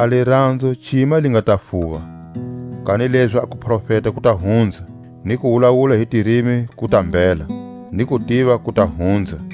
A liranzo cima li nga ta fuva. Kanilezi a kuprofeta ku ta hunza; ni ku wulawula hi tirimi ku ta mbhela; ni kutiva ku ta hunza.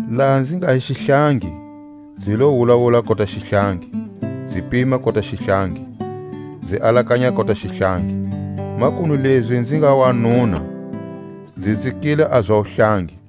Laha nzi nga hi xihlangi, nzi lo wulawula kota xihlangi, nzi pima kota xihlangi, nzi alakanya kota xihlangi; makunu lezi nzi nga wanuna, nzi tsikile a za wuhlangi.